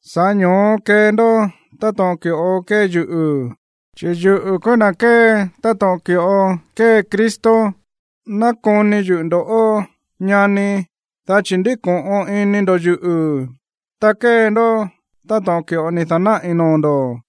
Sa̱ꞌá ño̱ó kee ndó táto̱ꞌon ki̱ꞌo kée yuꞌu̱, chi̱ yuꞌu̱ kúú na̱ kée táto̱ꞌon ki̱ꞌo kée Cristo. Nákoni yuꞌu̱ ndo̱ꞌó, ñani, dá chi̱ ndíko̱ꞌon ini ndo̱ yuꞌu̱, ta kée ndó táto̱ꞌon ki̱ꞌo ni̱ da̱náꞌi̱ noo̱ ndo̱.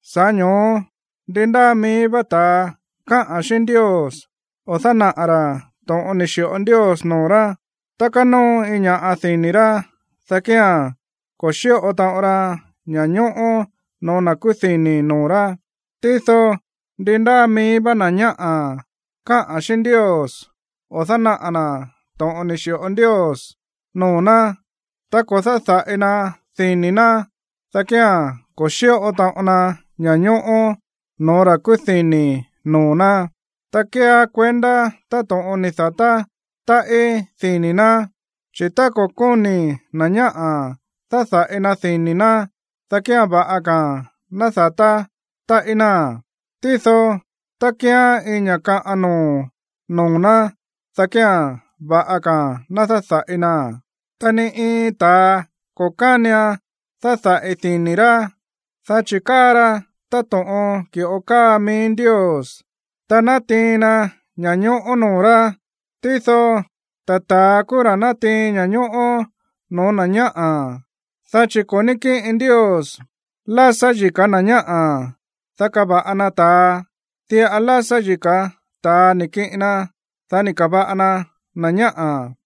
Sa̱ꞌá ño̱ó ndi ndáa mií vá ta̱a káꞌa̱n xíꞌín Ndios o dánaꞌa̱ ra̱ to̱ꞌon ni̱ xi̱ꞌo Ndios noo̱ rá tá kánóo iin ña̱ꞌa dini̱ rá, dá kía̱n ko̱ xíꞌo taꞌon ra ña̱ñóꞌó no̱ó na̱ kúú dini̱ noo̱ rá. Tído ndi ndáa mií vá na̱ ñáꞌa̱ káꞌa̱n xíꞌín Ndios o dánaꞌa̱ na̱ to̱ꞌon ni̱ xi̱ꞌo Ndios noo̱ ná tá ko̱ dáda̱ꞌi na dini̱ ná, dá kía̱n ko̱ xíꞌo taꞌon na ña̱ñóꞌó no̱ó ra̱ kúú dini̱ noo̱ ná, ta kéeá kuendá táto̱ꞌon ni̱ da̱tá táꞌí dini̱ ná. Chi̱ tá ko̱ kóni̱ na̱ ñáꞌa̱ dáda̱ꞌi na dini̱ ná, dá kía̱n va̱ꞌa ka̱a̱n ná da̱tá táꞌí náa̱n. Tído tá kíán iin ña̱ kaꞌan noo̱ noo̱ ná, dá kía̱n va̱ꞌa ka̱a̱n ná dáda̱ꞌi naa̱n. Ta ni iin ta̱a ko̱ kánian dáda̱ꞌi dini̱ rá, dá chi̱ káa ra táto̱ꞌon ki̱ꞌo káa mií Ndios, ta nátiin na ña̱ñóꞌó noo̱ rá. Tído ta̱ ta̱a kúú ra̱ nátiin ña̱ñóꞌó no̱ó na̱ ñáꞌa̱, dá chi̱ ko̱ ní kíꞌin Ndios lásá yika̱ na̱ ñáꞌa̱, dá kava̱ꞌa na ta̱a, diꞌa lásá yika̱ ta̱a ni̱ kiꞌin na, dá ni̱ ka̱va̱ꞌa na na̱ ñáꞌa̱.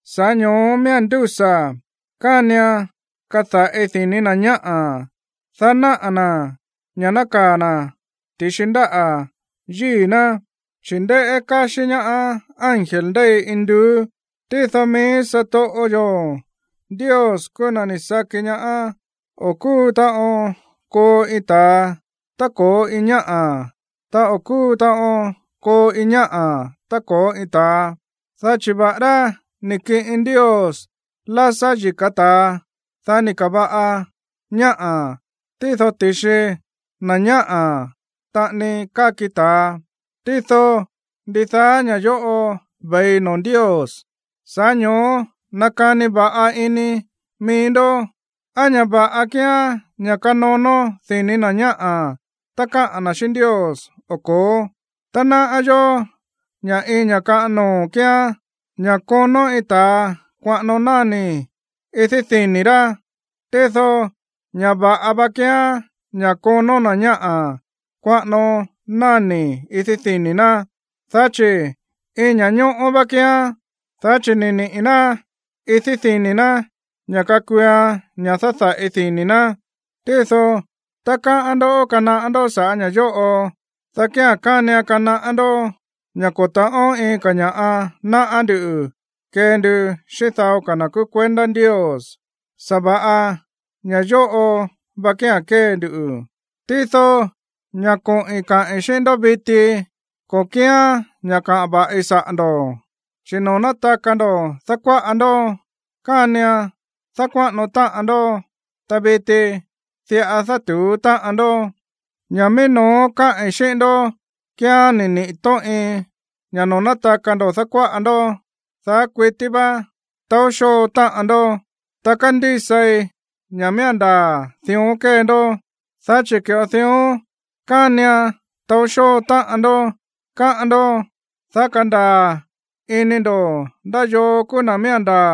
Sa̱ꞌá ño̱ó miía̱n ndúsa̱ kánian kada̱ꞌi dini̱ na̱ ñáꞌa̱, dá náꞌa̱ na̱ ña̱ nákaa̱ na̱ ti̱xi ndáꞌa̱ yíi̱ ná, chi̱ ndéꞌé káxí ñaá ángel ndéi induú. Tído mií satoꞌo yo̱ Ndios kúú na̱ ni̱ saki ña̱ o̱ kúu taꞌon koo iin ta̱a tá ko̱ó iin ñáꞌa̱, ta o̱ kúu taꞌon koo iin ñáꞌa̱ tá ko̱ó iin ta̱a, dá chi̱ va̱ꞌará ni̱ kiꞌin Ndios lásá yika̱ ta̱a, dá ni̱ ka̱va̱ꞌa na̱ ñáꞌa̱, tído ti̱xi na̱ ñáꞌa̱ taꞌani káki ta̱a. Tído ndidaá ña̱ yóꞌo ve̱i noo̱ Ndios. Sa̱ꞌá ño̱ó nakani va̱ꞌa ini mií ndó, ¿á ña̱ va̱ꞌa kíán ña̱ kanonó dini̱ na̱ ñáꞌa̱ tá káꞌa̱n na̱ xíꞌín Ndios o ko̱ó? Ta náꞌá yó ña̱ iin ña̱ kaꞌan noo̱ kíán ña̱ konó iin ta̱a kuaꞌano náni̱ idí dini̱ rá. Tído ña̱ va̱ꞌa va kíán ña̱ konó na̱ ñáꞌa̱ kuaꞌano náni̱ idí dini̱ ná, dá chi̱ iin ña̱ñóꞌó vá kíán, dá chi̱ ni̱ niꞌi̱ ná idí dini̱ ná ña̱ kakuuan ña̱ dáda̱ꞌi dini̱ ná. Tído tá káꞌán ndó kanaꞌá ndó saꞌa̱ ña̱ yóꞌo, dá kía̱n kánian kanaꞌá ndó ña̱ ko̱ ta̱ꞌón iin ka̱ ña̱ꞌa náꞌá nduꞌu̱ kee ndu xíꞌín dao ka̱ na̱ kúú kuendá Ndios, sa̱va̱ꞌa ña̱ yóꞌo va kía̱n kée ndu. Tído ña̱ koꞌi̱n kaꞌi̱n xíꞌín ndó viti, ko̱ kíán ña̱ káꞌa̱n va̱ꞌi saꞌa̱ ndo̱, chi̱ noo̱ nátaka ndo̱ dákuáꞌa ndó kánian dákuáꞌano táꞌan ndó, ta viti diꞌa dátu̱ú táꞌan ndó. Ña̱ mií no̱ó káꞌi̱n xíꞌín ndó kía̱n ni̱ niꞌi̱ tóꞌin ña̱ noo̱ nátaka ndo̱ dákuáꞌa ndó, daá kuití vá taó xóo táꞌan ndó. Ta kándísai ña̱ miía̱n ndaa̱ dión kée ndó. Dá chi̱ ki̱ꞌo dión kánian taó xóo táꞌan ndó, káꞌán ndó, dá kándaa̱ ini ndo̱ ndá yoo kúú na̱ miía̱n ndaa̱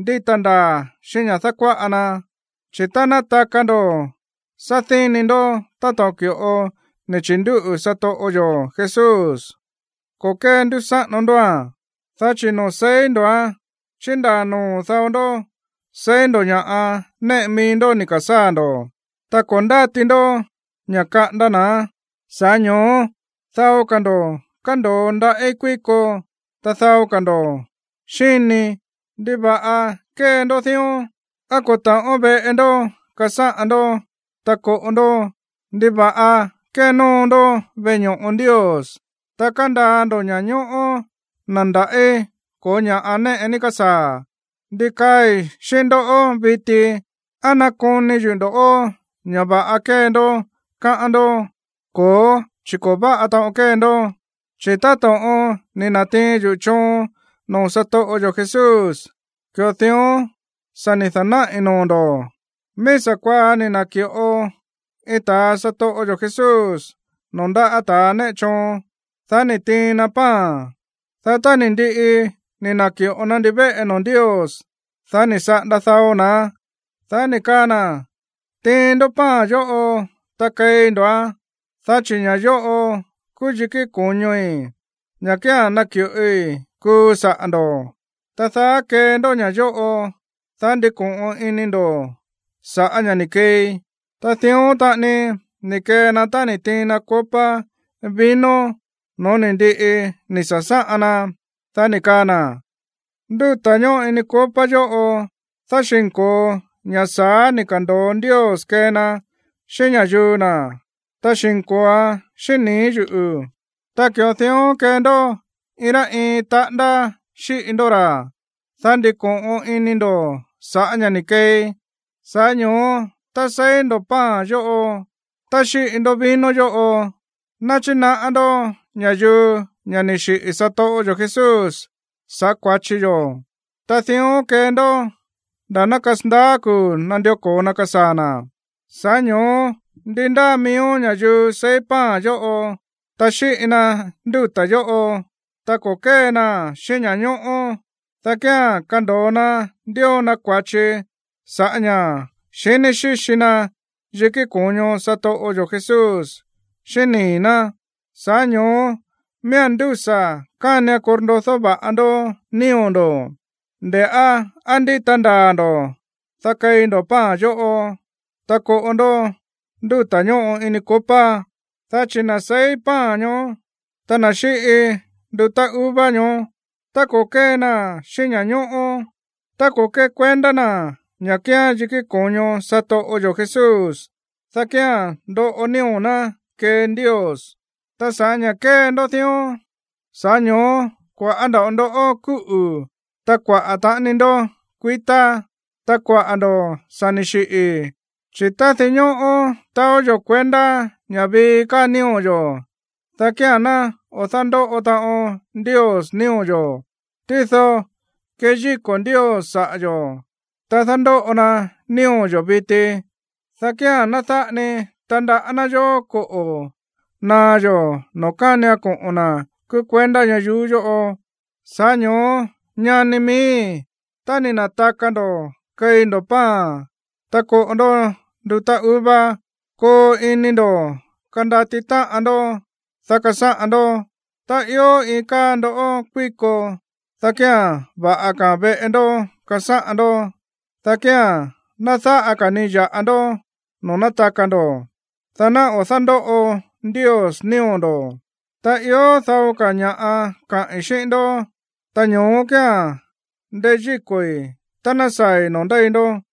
ndíta ndaa̱ xíꞌín ña̱ dákuáꞌa na. Chi̱ tá nátaka ndo̱ sádíni ndó táto̱ꞌon ki̱ꞌo ni̱ chi̱ndúꞌu̱ satoꞌo yo̱ Jesús, ko̱ kéndúsáꞌano ndóa̱n. Dá chi̱ noo̱ seí ndo̱án, chíndaa noo̱ dao ndó seí ndo̱ ña̱ néꞌe mií ndó ni̱ ka̱sáa̱ ndo̱, ta ko̱ ndáti ndó ña̱ kaꞌanda na̱án. Sa̱ꞌá ño̱ó dao ka̱ ndo̱ kándo̱o ndaꞌí kuíko, ta dao ka̱ ndo̱ xíni. ¿Ndiva̱ꞌa kée ndó dión? ¿Á ko̱ ta̱ꞌón veꞌe ndó kasáꞌan ndó, ta koꞌo ndó? ¿Ndiva̱ꞌa kénóo ndó veꞌe ño̱ꞌo Ndios, ta kándaa ndo̱ ña̱ñóꞌó na̱ ndaꞌí ko̱ó ña̱ꞌa néꞌe ni̱ ka̱sáa̱? ¿Ndi kaai̱ xíꞌín ndó viti? ¿Á nakoni yuꞌu̱ ndo̱ꞌó ña̱ va̱ꞌa kée ndó, káꞌán ndó? Ko̱ó, chi̱ ko̱ váꞌa taꞌon kée ndó. Chi̱ táto̱ꞌon ni̱ na̱tiin yuꞌu̱ choon noo̱ satoꞌo yo̱ Jesús, ki̱ꞌo dión sa̱ ni̱ da̱náꞌi̱ noo̱ ndo̱: Mií sa̱kuaá ni̱ na̱ki̱ꞌo iin ta̱a satoꞌo yo̱ Jesús noo̱ ndáꞌa̱ ta̱ néꞌe choon, dá ni̱ tiin na pan. Dá tá ni̱ ndiꞌi ni̱ na̱ki̱ꞌo na ndivéꞌe noo̱ Ndios, dá ni̱ saꞌanda dao na̱án, dá ni̱ kaa na̱: “Tiin ndó pan yóꞌo, ta keí ndo̱án, dá chi̱ ña̱ yóꞌo kúú yikí ko̱ñoi̱, ña̱ kía̱n naki̱ꞌoi kuu saꞌa̱ ndo̱. Ta daá kee ndó ña̱ yóꞌo, dá ndiko̱ꞌon ini ndo̱ sa̱ꞌá ña̱ ni̱ keei.” Ta dión taꞌani ni̱ kee na tá ni̱ tiin na copa vino no̱ó ni̱ ndiꞌi ni̱ sa̱sáꞌan na, dá ni̱ kaa na̱: “Ndúta̱ ñóꞌo ini copa yóꞌo dáxi̱nko̱o ña̱ sa̱á ni̱ ka̱ndo̱o Ndios kee na xíꞌín ña̱yuu na̱, ta xínko̱oan xíꞌín nii̱ yúꞌu̱. Ta ki̱ꞌo dión kee ndó iin rá iin taꞌándá xíꞌi ndó ra̱, dá ndiko̱ꞌon ini ndo̱ sa̱ꞌá ña̱ ni̱ keei.” Sa̱ꞌá ño̱ó tá seí ndo̱ pan yóꞌo, ta xíꞌi ndó vino yóꞌo, náchinaꞌá ndó ña̱yuu ña̱ ni̱ xiꞌi̱ satoꞌo yo̱ Jesús sa̱ꞌá kua̱chi yo̱. Ta dión kee ndó nda̱ ná kasandaá kuu̱ nandió ko̱o na kasaa̱ na̱. Sa̱ꞌá ño̱ó ndi ndáa miíó ña̱yuu seí pan yóꞌo, ta xíꞌi na ndúta̱ yóꞌo, ta ko̱ kée naa̱n xíꞌín ña̱ñóꞌó, dá kía̱n kando̱o na ndío na kua̱chi sa̱ꞌá ña̱ xiní xíxi na yikí ko̱ño satoꞌo yo̱ Jesús xíꞌín nii̱ ná. Sa̱ꞌá ño̱ó miía̱n ndúsa̱ kánian korndodó va̱ꞌa ndó nío̱ ndo̱, nde̱ꞌá á ndíta ndaa̱ ndo̱, dá keí ndo̱ pan yóꞌo, ta koꞌo ndó ndúta̱ ñóꞌo ini copa. Dá chi̱ na̱ seí pan ñoó, ta na̱ xíꞌi ndutá uva ñoó, ta ko̱ kée naa̱n xíꞌín ña̱ñóꞌó, ta ko̱ kékuendá na̱ ña̱ kíán yikí ko̱ño satoꞌo yo̱ Jesús, dá kía̱n ndoꞌo nío̱ ná kee Ndios. Ta sa̱ꞌá ña̱ kée ndó dión, sa̱ꞌá ño̱ó kua̱ꞌá nda̱ꞌo ndó kúꞌu̱, ta kuaꞌa̱ taꞌani ndó kuitá, ta kuaꞌa̱ ndo̱ sa̱ ni̱ xiꞌi̱. Chi̱ tá dinñóꞌó taó yo̱ kuendá ña̱ vii káa nío̱ yo̱, dá kía̱n ná o̱ dándóꞌo taꞌon Ndios nío̱ yo̱. Tído kéyíko̱ Ndios saꞌa̱ yo̱, ta dándóꞌo na nío̱ yo̱ viti, dá kía̱n ná dáꞌa ni tandaꞌá ná yó koꞌo̱ naá yó noo̱ kánian koꞌo̱n na̱ kúú kuendá ñayuú yóꞌo. Sa̱ꞌá ño̱ó, ñani miíi̱, tá ni̱ na̱taka ndo̱ keí ndo̱ pan, ta koꞌo ndó ndutá uva, koo ini ndo̱ kandati táꞌan ndó, dá kasáꞌan ndó. Tá ió iin káa ndó kuíko, dá kía̱n va̱ꞌa ka̱ veꞌe ndó kasáꞌan ndó, dá kía̱n ná dáꞌa ka̱ ni ya̱ꞌa ndó noo̱ nátaka ndo̱, dá ná o̱ dándóꞌo Ndios nío̱ ndo̱. Ta ió dao ka̱ ña̱ꞌa kaꞌi̱n xíꞌín ndó, ta ño̱ó kía̱n ndeyíko̱i̱ tá ná saa̱i̱ noo̱ ndéi ndó.